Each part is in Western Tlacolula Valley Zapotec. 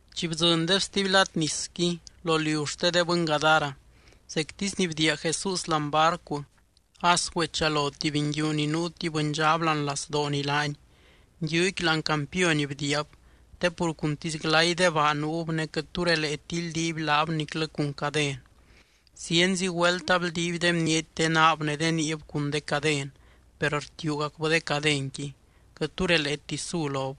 Chi bdzɨndeb stuby lad nisqui, lo liu xte de bɨny Gadara, zectisy ni bdiia Jesús láani barcu, as güechalo tuby nguiu ni nuu tuby bɨndxab láani lazdooni laany. Nguiuqui láani campiony bdiiab. Te pur cuntisy glay de baa nuub ne quɨt tu releeti ildiiby laab niclɨ cun caden. Zienzi güelt abldiiby de bniety de naab ne de niib cun de caden, per rtiuugacbɨ de cadenqui. Quɨt tu releeti su lob.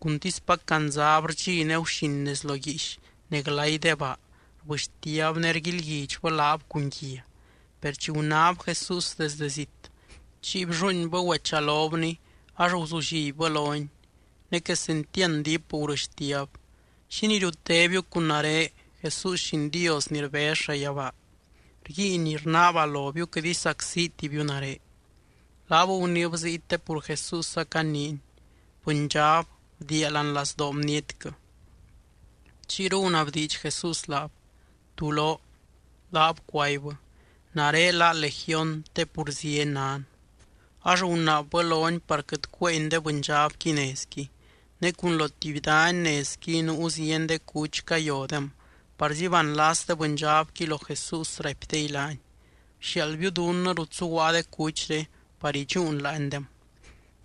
Cuntispac candzab rdxi ne guxin nez lo guiix ne glay de baa, rbɨxtiab ne rguilguidxbɨ laab cun guia. Per chi gunáb Jesús desdɨ zit, chiy blluuinbɨ güechalobny, ax guzullibbɨ lony. Ne quesentiand diip gurɨxtiab: —¿Xínii riutétibiu cun nare, Jesús Lliin Dios ni rbez llayabaa? Rguiin rnaaba lobiu quɨt isacsitibiu nare. Laab guniib ziy te pur Jesús acaniiny: —¡Bɨndxab, bdiia láani lazdoo bnietquɨ! Chiyru gunabdiidx Jesús laab: —¿Tú lóo? Laab cuaibbɨ: —Nare lá Legión te pur zieny nan. Ax gunaabbɨ lony par quɨt cuéeny de bɨndxabqui nezqui. Ne cun lo tuby dany nezqui nuu zieny de cuch cayodem parzi banlas de bɨndxabqui lo Jesús, raipdey laany: —Bxiaaldbiu dunnɨ rut zuguaa de cuchre par idxúun láandem.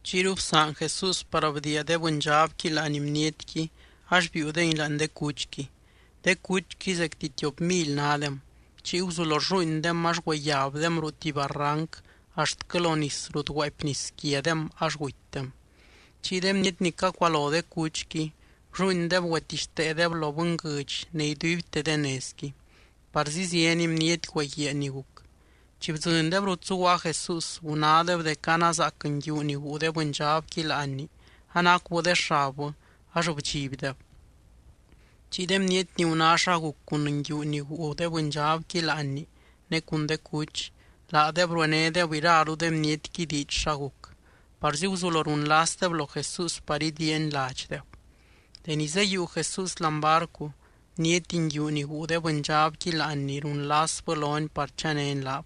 Chiyru bsaan Jesús par bdiia de bɨndxabqui láani bnietqui ax biiudengui láani de cuchqui. De cuchqui zecti tiop mily nádem. Chiy guzulo rlluuindem ax güeyabdem ruu tuby barranc axtquɨ lo nis rut guaapy nis quiadem ax gutydem. Chiy de bniety ni cacualo de cuchqui, blluuindeb güetixteedeb lo bɨnguɨdx ne iduibte de nezqui. Parzi zieny bniety güeguiaa ni guc. Chi bdzɨndeb rut zuguaa Jesús, gunádeb dec anazaac nguiu ni guu de bɨndxabqui láanni anacubɨ de xabbɨ, ax bdxibdeb. Chiy de bniety ni guná xa guc cun nguiu ni guu de bɨndxabqui láanni ne cun de cuch, laadeb ruenédeb iraru de bnietqui diidx xa guc. Parzi guzulo runlasdeb lo Jesús par idiiany ladxdeb. Deni zeyiiu Jesús láani barcu, bniety nguiu ni guu de bɨndxabqui láanni runlasbɨ lony par chanény laab.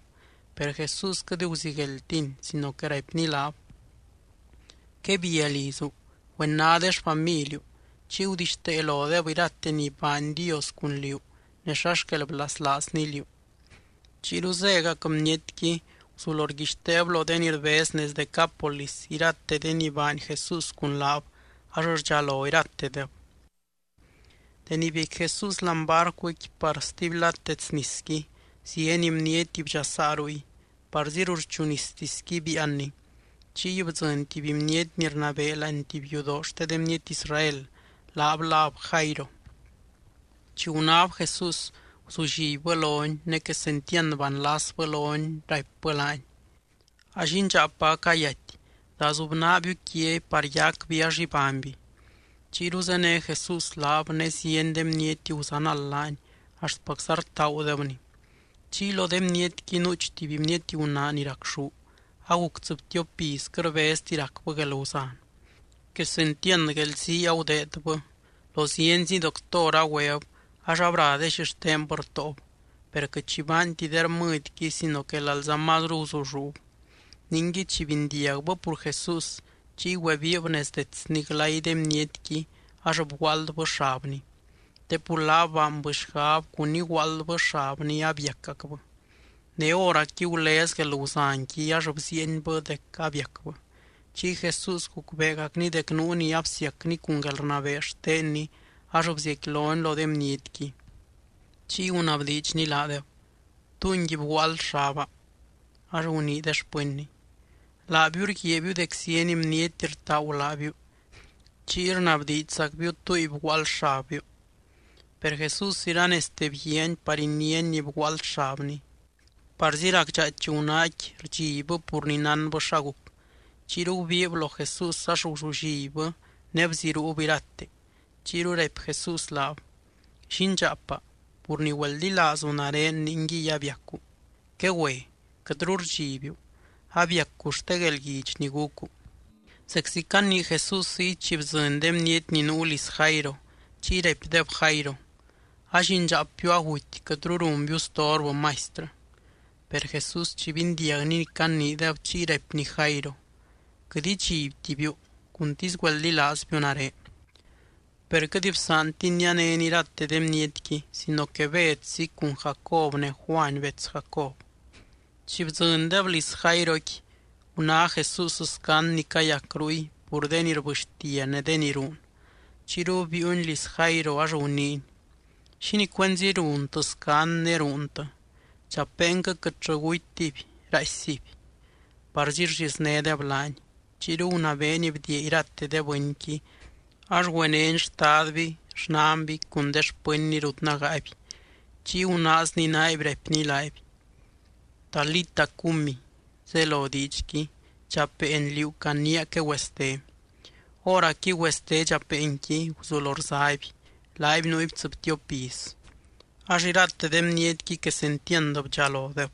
Per Jesús quɨt guzigueldtiny sino que raipny laab: —Quebia lizu. Güena de xfamiliu. Chiy gudixtee lodeb irate ni baany Dios cun liú, ne xa xquel blaslaazny liú. Chiyru zégac bnietqui, guzulo rguixteeb lo de ni rbez nez Decápolis irate de ni baany Jesús cun laab, ax rdxalo iratedeb. Deni biecqui Jesús láani barcuqui par stuby lad dets nisqui, zieny bniety bdxasaa ruy, parzi ruxchu nistisqui biianny. Chiy bdzɨny tuby bniety ni rnabee láani tuby yudoo xte de bniety Israel, laab láb Jairo. Chi gunáb Jesús guzullibbɨ lony ne quesentiand banlasbɨ lony, raipbɨ laany: —A llindxaapa acayaty. Dazubnaabiu quiaby par yacby ax ibányby. Chiyru zéne Jesús laab, ne zieny de bniety guzanald laany axtpacza rtaagudebny. Chiy lo de bnietqui, nuuch tuby bniety gunaa ni racxú, aguc tsɨbtiop iz quɨt rbezti racbɨ guelguzan. Quesentiand guelzii agudeedbɨ, lo zienzi doctor agüeb ax abra de xixtenbɨ rtóob. Per quɨt xi baanti de rmɨdyqui sino que lalza mazru guzulluub. Ningui, chi bindiagbɨ pur Jesús, chiy güebiib nez detsny glay de bnietqui ax bguaaldbɨ xabny. Te pur laab baanbɨ xgab cun iguaaldbɨ xabny abiacacbɨ. Ne hóracqui gulez guelguzanqui ax bziienbɨ dec abiacbɨ. Chiy Jesús gucbeegacny dec nuu ni absiacny cun guelrnabee xtenny, ax bziecquilony lo de bnietqui. Chiy gunabdiidxny laadeb: —¿Túngui bguaald xaba? Ax gunii de xpɨnny: —Laabiu rguiaabiu dec zieny bniety rtaagu laabiu. Chiy rnabdiidxzacbiu: “¿Túngui bguaald xabbiu?” Per Jesús iranezte bguiaany par iniány ni bguaald xabny. Parzi racdxaaich gunaaqui rdxibbɨ pur ni nánbɨ xa guc. Chiyru gubiib lo Jesús ax guzullibbɨ ne bziruub irate. Chiyru raipy Jesús laab: —Llindxaapa, pur ni güeldilaazu nare ningui abiacu. Quegüe. Quɨtru rdxibiu, abiacu xte guelguidx ni gucu. Zeczi canii Jesús ziy, chi bdzɨny de bniety ni nuu liz Jairo, chiy raipdeb Jairo: —A llindxaapbiu aguty, quɨtru runbiu storbɨ Maistrɨ. Per Jesús chi bindiagny ni caniideb, chiy raipny Jairo: —Quɨt idxibtibiu. Cuntisy güeldilaazbiu nare. Per quɨt bsaantiny nianény irate de bnietqui sino que Bedzi, cun Jacob ne Juany bets Jacob. Chi bdzɨndeb liz Jairoqui, guná Jesús scand ni cayac ruy pur de ni rbɨxtia ne de ni ruun. Chiyru biiuny liz Jairo ax guniiny: —¿Xínii cuenzi runtɨ scand ne ruuntɨ? Dxapeenquɨ quɨtllɨ gutytiby, raaissiby. Parzi rlliznédeb laany. Chiyru gunabeeny bdiia irate de bɨnqui. Ax güenény xtadby, xnanby cun de xpɨnny rut nágaaby. Chiy gunaazny naaby raipny laaby: —Talita, cumi —zelo diidxqui: Dxapeen, liú caniia quegüeste. Hóracqui güeste dxapeenqui guzulo rzaby. Laaby nuuby tsɨbtiop iz. Ax irate de bnietqui quesentiand bdxalodeb.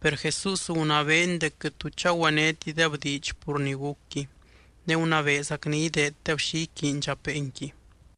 Per Jesús gunabeeny dec quɨt tu chagüenétideb diidx pur ni gucqui, ne gunabeezacny ideeddeb xi iquiiny dxapeenqui.